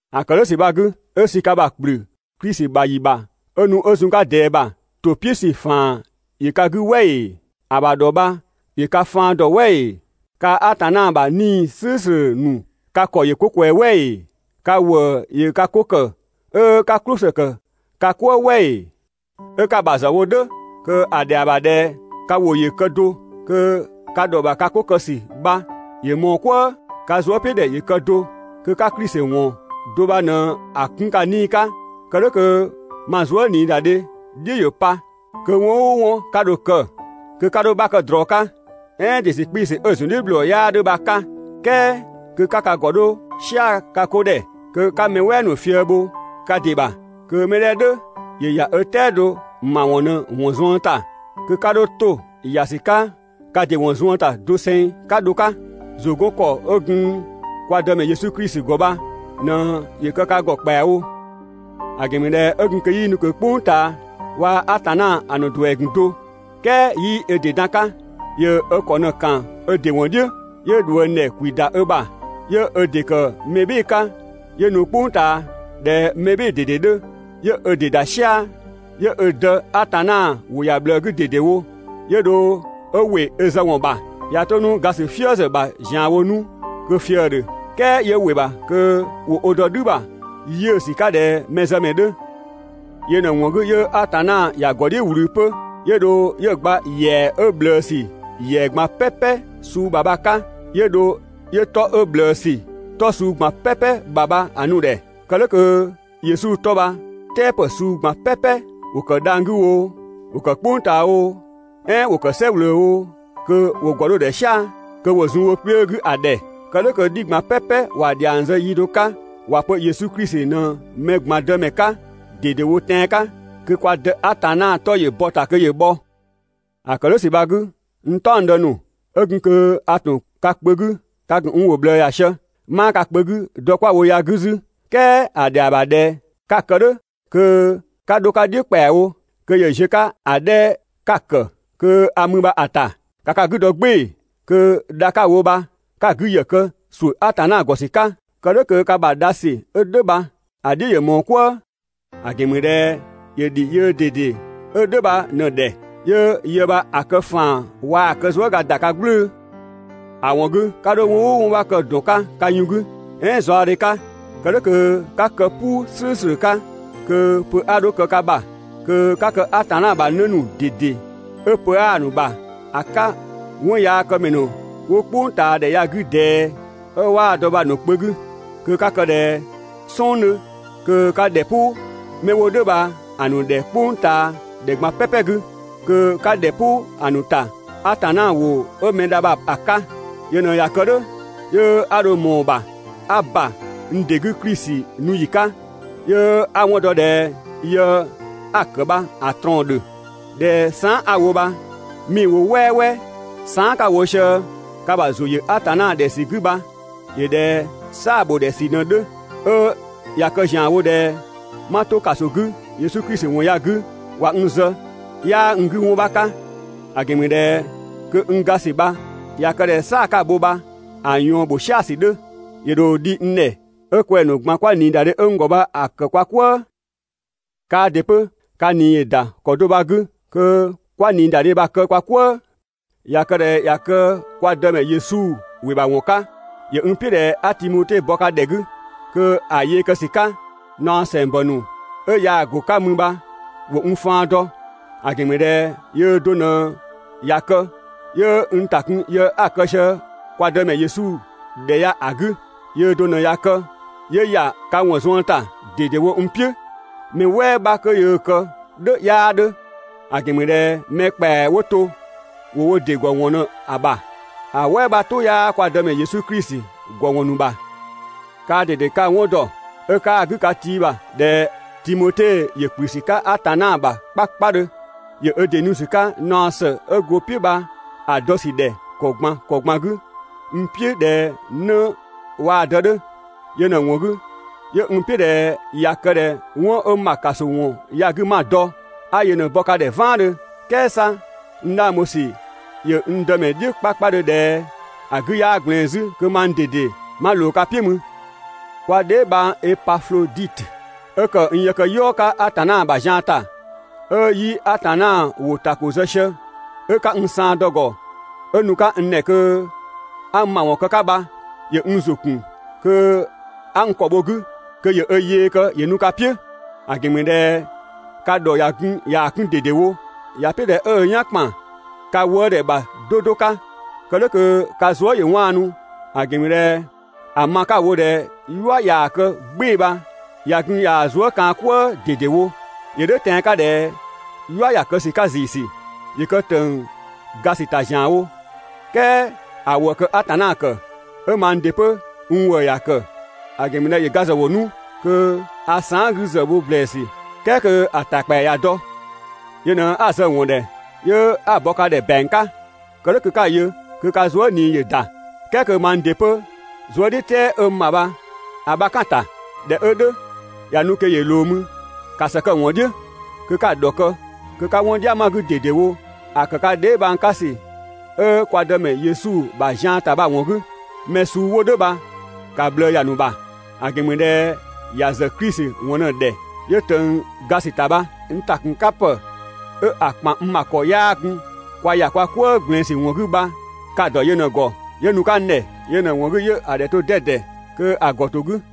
‑A ‑kë "dhʋ̈ ‑sü bha‑ 'gü, 'ö sü ka ‑bha ‑kplü Klisi ‑bha ‑yi ‑bha 'ö nu 'ö zun‑ 'ka ꞊dɛɛ ‑bha, ‑to "piʋ̈ ‑sü ‑faan ‑yö ka 'gü "wɛ ‑ee? ‑A ‑bha ‑dhɔ bha ‑yö kë ka faan ‑dɔ "wɛ ‑ee? Kaa‑ Atanna ‑bha 'Nii‑ "slʋ̈ʋ̈slʋ̈ ‑nu ka ‑kɔ ‑yö 'ko ꞊kwɛɛ‑ "wɛ ‑ee? Ka ‑wëë ‑yö ka 'ko ‑kë 'ö 'ka "klʋsë ‑kë ka "kwëë "wɛ ‑ee? 'Ö 'ka‑ ‑bha ‑zë wo "dhʋ̈ kö‑ ‑dhɛa ‑bha ꞊dhɛ ka ‑wʋ ‑yö kë do, kö ka ‑dhɔ ‑bha ka 'ko kë ‑sü bha ‑yö ꞊mɔɔ "kwëë, ka zuëpiʋ̈dhɛ ‑yö kë do, kö 'ka Klisi ‑wɔn do bha ꞊në‑ 'kun ka 'nii‑ 'ka, kë "dhʋ̈ kö ma zuëniidadhe "dhiʋ̈ ‑yö pa. Kö 'wɔn "ʋʋ 'wɔn 'ka dho‑ kë, kö 'ka 'dho‑ 'bha kë ꞊drɔ 'ka, "ɛɛn ‑dɩ ‑sü 'kpii‑ ‑sü 'ö‑ ‑zundhiʋ̈bhlɔɔ 'yaa 'dhö bha‑ 'ka. "Kɛɛ kö 'ka ka ‑gɔ 'dho "sia‑ ka 'ko ‑dhɛ, kö 'ka mɛ "wɛɛ ‑nu fië‑ bho ka ‑dɩ ‑bha! Kö 'mɛ 'dhɛ "dhʋ̈ ‑yö ‑ya ö "tɛado ‑mawɔn ꞊në‑ ‑wɔn zuën ‑ta, kö 'ka 'dho 'to ‑ya ‑sü 'ka ka ‑dɩ ‑wɔn zuën ‑ta doseng 'ka dho‑ 'ka. ‑Zʋ 'gɔn ‑kɔ 'ö gun (kwa Dëmɛ) Yesu Klisi ‑gɔ bha ꞊në ‑yö kë ka ‑gɔ ‑kpɛawo. ‑A ‑gɛn ‑mü ꞊dhɛ 'ö gun kö 'yii nu ꞊kö "kpʋng ꞊taa waa‑ Atanna ‑a ‑nu ‑duɛ ‑gun do, "kɛɛ 'yii ö ‑dɩ dan‑ 'ka. ‑Yö ö ‑kɔ ꞊në ‑kan ö ‑dɩ ‑wɔn "dhiʋ̈, 'yö ꞊dhuëngdhɛ ‑kwi ‑da ö ‑bha, 'yö ö ‑dɩ ‑kë mɛ "bhɩɩ‑ 'ka 'yö nu "kpʋng ꞊taa ꞊dhɛ mɛ "bhɩɩ‑ ꞊dede 'dhö, 'yö ö ‑dɩ ‑da "sia‑, 'yö ö Dë Atanna ‑wʋ ‑ya ꞊bhlëë 'gü ꞊dedewo, 'yö dho 'ö ‑wɩ ö zë ‑wɔn ‑bha, ꞊ya 'to 'nu ga ‑sü "fië ‑zë ‑bha ‑zianwo 'nu kö‑ fië‑ ‑dhö, "kɛɛ 'yö ‑wɩ ‑bha kö ‑wo ö dɔ "dhü ‑bha 'yiʋ̈sü 'ka ꞊dhɛ mɛzëmɛ 'dhö. Yö ꞊në‑ ‑wɔn 'gü 'yö Atanna ‑ya ‑gɔ "dhiʋ̈ ꞊wlü 'pö, 'yö dho 'yö‑ gba ‑yɛa 'ö ꞊bhlëësü ‑yɛa ꞊gban "pɛpɛ suu ‑bha bha‑ 'ka, 'yö dho 'yö 'tɔ 'ö ꞊bhlëësü 'tɔ suu ꞊gban "pɛpɛ ‑bha bha‑ nu‑ ‑dhɛ. Kë "dhʋ̈ kö Yesu 'tɔ bha "tɛɛpë suu ꞊gban "pɛpɛ, ‑wo ‑kë dhang‑ 'gü oo, ‑wo ‑kë "kpʋng ꞊taa oo, "ɛɛn ‑wo kë "sɛ ꞊wlöö oo, kö ‑wo ‑gɔ 'dho‑ ‑dhɛ "sia‑, kö ‑wo zun wo kpiö 'gü ‑a ‑dhɛ. Kë "dhʋ̈ kö "dhi ꞊gban "pɛpɛ ‑wa ‑dhiang zë yi do 'ka ‑wa pö Yesu Klisi ꞊në mɛ ꞊gban Dëmɛ 'ka ꞊dedewo tɛan‑ 'ka, kö kwa Dë Atanna 'tɔ ‑yö bɔ‑ ‑ta kö ‑yö bhɔ. ‑A ‑kë "dhʋ̈ ‑sü bha‑ 'gü, n "taɔngdë ‑nu, 'ö gun kö a ‑tun ka kpö 'gü, ka ‑gun n ‑wʋ ꞊bhlëë ‑ya sië. 'Maa ka kpö 'gü dɔ 'kwa‑ wo ya‑ 'gü 'zü, "kɛɛ ‑a ‑dhɛa ‑bha ꞊dhɛ 'ka‑ kë "dhʋ̈ kö 'ka 'dho‑ 'ka "dhiʋ̈ ‑kpɛawo, kö ‑yö ziö‑ 'ka ‑a 'dhɛ 'ka‑ ‑kë kö a mü bha‑ ‑ta. ‑Ka ka 'gü dɔ "gbɩɩ‑ kö dha 'ka‑ wo bha 'ka‑ 'gü ‑yë kë ‑suʋ̈ Atanna ‑gɔ ‑sü 'ka. Kë "dhʋ̈ kö ka ‑bha dha ‑sü 'ö "dhʋ̈ bha‑ "dhiʋ̈ ‑yö ꞊mɔɔ "kwëë! ‑A ‑gɛn ‑mü ꞊dhɛ ‑yö ‑dhi yöö ꞊dede 'ö "dhʋ̈ bha ꞊në‑ ‑dhɛ 'yö yë bha‑ kë ‑faan waa‑ kë zuëga ‑da ka "gblʋ̈ʋ̈‑. ‑A ‑wɔn 'gü 'ka 'dho 'wɔn "ʋʋ 'wɔn 'bha kë ‑dɔn 'ka ka yun 'gü, "ɛɛn zaɔdhe 'ka. Kë "dhʋ̈ kö 'ka kë "puu "slʋ̈ʋ̈slʋ̈ 'ka, kö pö 'a 'dho kë ka ‑bha, kö 'ka kë Atanna ‑bha 'në ‑nu ꞊dede 'ö pö 'aa‑ ‑nu bha‑ 'ka 'wɔnyaakëmɛ ‑nu 'wo "kpʋngtaadhɛ ya‑ 'gü ꞊dɛɛ, 'ö 'waa‑ dɔ bha‑ ‑nu kpö 'gü. Kö 'ka kë ꞊dhɛ "sɔng 'dhö kö 'ka ‑dhɛ "pʋ 'mɛ 'wo "dhʋ̈ bha‑ ‑nu ‑dhɛ "kpʋngtaadhɛ ꞊gban "pɛpɛ 'gü. Kö 'ka ‑dhɛ "pʋ‑ ‑nu ‑ta Atanna ‑wʋ 'ö mɛ dha bha‑ 'ka. Yö ꞊në ꞊ya kë "dhʋ̈, 'yö 'a dho ꞊mɔɔ‑ ‑bha 'a ‑ba n ‑dɩ 'gü Klisi nu ‑yi 'ka, 'yö 'a‑ 'wɔn dɔ ꞊dhɛ yë 'a‑ ‑kë bha‑ ꞊trɔɔn‑ ‑dhö, ꞊dhɛ saan" 'a‑ wo bha 'mii‑ wo "wɛɛwɛɛ. Saan" ka‑ wo sië ka ‑bha ‑zʋ ‑yö Atanna ‑dhɛ ‑sü 'gü bha ‑yö ꞊dhɛ "saa‑ ‑bho ‑dhɛ ‑sü ꞊në‑ 'dhö. 'Ö ꞊ya kë ‑zianwo ꞊dhɛ 'ma 'to ‑kaso 'gü Yesu Klisi ‑wɔn ya‑ 'gü ꞊wa n zë, 'yaa n 'gü 'wɔn 'bha 'ka, ‑a ‑gɛn ‑mü ꞊dhɛ kö n ga ‑sü bha ꞊ya kë ꞊dhɛ "saa‑ 'ka‑ bho bha‑ ꞊yɔɔn ‑bho "sia‑ ‑sü 'dhö, ‑yö ‑dho dhi n ‑dhɛ 'ö kwɛng‑ ‑nu ꞊gban 'kwa ꞊niidadhe 'ö n ‑gɔ bha‑ ‑kë kwa "kwëë. Kaa ‑dɩ 'pö ka ꞊nii ‑yö ‑da ‑kɔ do bha‑ 'gü, kö kwa‑ ꞊niidadhe bha‑ kë kwa "kwëë. ꞊Ya kë ꞊dhɛ ꞊ya kë kwa Dëmɛ Yesu ‑wɩ ‑bha ‑wɔn 'ka, ‑yö n "piʋ̈ ꞊dhɛ 'a Timote bɔ ka ‑dhɛ 'gü, kö ‑a yee kë ‑sü 'ka, naɔ ‑sɛngbɔ ‑nu 'ö yaa‑ go‑ 'ka mü bha ‑wo n faan dɔ. ‑A ‑gɛn ‑mü ꞊dhɛ yöö do ꞊në ꞊ya kë, 'yö n ‑ta kun yë 'a‑ kë sië kwa Dëmɛ Yesu ‑dhɛ ya‑ 'gü. Yöö do ꞊në ꞊ya kë, 'yö ‑ya ka ‑wɔn zuën ‑ta ꞊dedewo n "piʋ̈, mɛ "wɛɛ 'bha kö yöö‑ kë "dhʋ̈ 'yaa 'dhö. ‑A ‑gɛn ‑mü ꞊dhɛ mɛ ‑kpɛa 'wo to ‑wo wo ‑dɩ ‑gɔ ‑wɔn ꞊në‑ bha, ‑a "wɛɛ 'bha "tʋ 'yaa (kwa Dëmɛ) Yesu Klisi ‑gɔ ‑wɔn ‑nu ‑bha. Kaa ꞊dede ka‑ 'wɔn ‑dɔ 'ö 'kaa‑ 'gü ka tiibha ꞊dhɛ Timote ‑yö ‑kplü ‑sü 'ka Atanna ‑bha 'kpakpadhö. ‑Yö ö ‑dɩ nu ‑sü 'ka naɔ ‑së 'ö go‑ "piʋ̈ bha‑ dɔ ‑sü ‑dhɛ ‑kɔ ꞊gban ‑kɔ ꞊gban 'gü n "piʋ̈ ꞊dhɛ 'në waa‑ dë 'dhö. Yö ꞊në‑ ‑wɔn 'gü, 'yö n "piʋ̈ ꞊dhɛ ꞊ya kë ꞊dhɛ 'wɔn 'ö ma ‑kaso ‑wɔn ya‑ 'gü 'ma‑ dɔ, 'a yö ꞊në‑ bɔ ka ‑dhɛ "vaandhö. "Kɛɛ 'sa n 'dhang bho ‑sü ‑yö n Dëmɛ "dhiʋ̈ 'kpakpadhö ꞊dhɛ ‑a 'gü 'yaa ꞊gblɛɛn 'zü kö mang ꞊dede 'ma ꞊loo ka "piʋ̈ mü. Kwa dheebhang Epafloditö 'ö ‑kë n yëkëyɔɔ 'ka Atanna ‑bha zian ‑ta, 'ö 'yi‑ Atanna ‑wʋ ‑ta ‑ko zë sië, 'ö 'ka n saan dɔ‑ ‑gɔ 'ö nu‑ 'ka n ‑dhɛ kö 'a n ‑mawɔn kë‑ 'ka bha ‑yö n ‑zʋ ‑kun kö 'a n ‑kɔ bho‑ 'gü kö ‑yö ö yee kë ‑yö nu ka "piʋ̈. ‑A ‑gɛn ‑mü ꞊dhɛ ka ‑dhɔ ꞊ya gun ꞊yaa‑ 'kun ꞊dedewo, ‑ya "piʋ̈ ꞊dhɛ 'ö ö "yan ‑kpan ka wëëdhɛ ‑bha 'do 'do 'ka, kë "dhʋ̈ kö ka zuë" ‑yö 'waanu, ‑a ‑gɛn ‑mü ꞊dhɛ ‑a ma 'ka‑ wo ꞊dhɛ "yua ꞊yaa‑ kë "gbɩɩ‑ bha ꞊ya gun ꞊yaa‑ zuë" kaan‑ "kwëë ꞊dedewo. ‑Yö "dhʋ̈ tɛan‑ 'ka ꞊dhɛ "yua ‑ya kë ‑sü 'ka ‑ziisü, ‑yö kë ‑tëng ga ‑sü ‑ta ‑zianwo, "kɛɛ ‑a ‑wëë kë Atanna ‑kë, 'ö mang ‑dɩ 'pö n ‑wëë ‑ya ‑kë, ‑a ‑gɛn ‑mü ꞊dhɛ ‑yö ‑ga ‑zë wo 'nu kö a saan" 'gü ‑zë wo ‑blɛɛsü, "kɛɛ kö‑ ‑ta ‑kpɛa ꞊ya dɔ. Yö ꞊në 'a‑ zë‑ ‑wɔn ‑dhɛ 'yö 'a‑ bɔ ka ‑dhɛ ‑bɛang 'ka, kë "dhʋ̈ kö 'ka‑ yö kö ka zuë" ꞊nii ‑yö ‑da, "kɛɛ kö mang ‑dɩ 'pö zuëdhiʋ̈tɛɛ 'ö n ‑bha bha‑ 'bha‑ "kan‑ ‑ta. ꞊Dhɛ 'ö "dhʋ̈, ꞊ya nu kö ‑yö ꞊loo mü, ‑ka ‑së kë‑ ‑wɔn "dhiʋ̈, kö 'ka‑ ‑dhɔkë, kö 'ka 'wɔn "dhia ma‑ 'gü ꞊dedewo ‑a ‑kë ka dheebhang 'ka ‑sü 'ö kwa Dëmɛ Yesu ‑bha zian ‑ta bha‑ ‑wɔn 'gü. Mɛ suu 'wo "dhʋ̈ bha ‑ka ꞊bhlëë ‑ya ‑nu ‑bha. ‑A ‑gɛn ‑mü ꞊dhɛ ‑ya ‑zë Klisi ‑wɔn ꞊në‑ ‑dhɛ 'yö ꞊tëng ga ‑sü ‑ta bha. N ‑takunkapë 'ö‑ ‑kpan n ‑bha ‑kɔ 'yaa gun (kwa ‑ya "kwëë ꞊gblɛɛn ‑sü ‑wɔn 'gü) bha ka‑ ‑dɔ yö ꞊në‑ ‑gɔ 'yö nu‑ 'ka n ‑dhɛ, yö ꞊në‑ ‑wɔn 'gü 'yö‑ ‑dhɛ to 'dɛdɛ kö‑ ‑gɔ ‑to 'gü.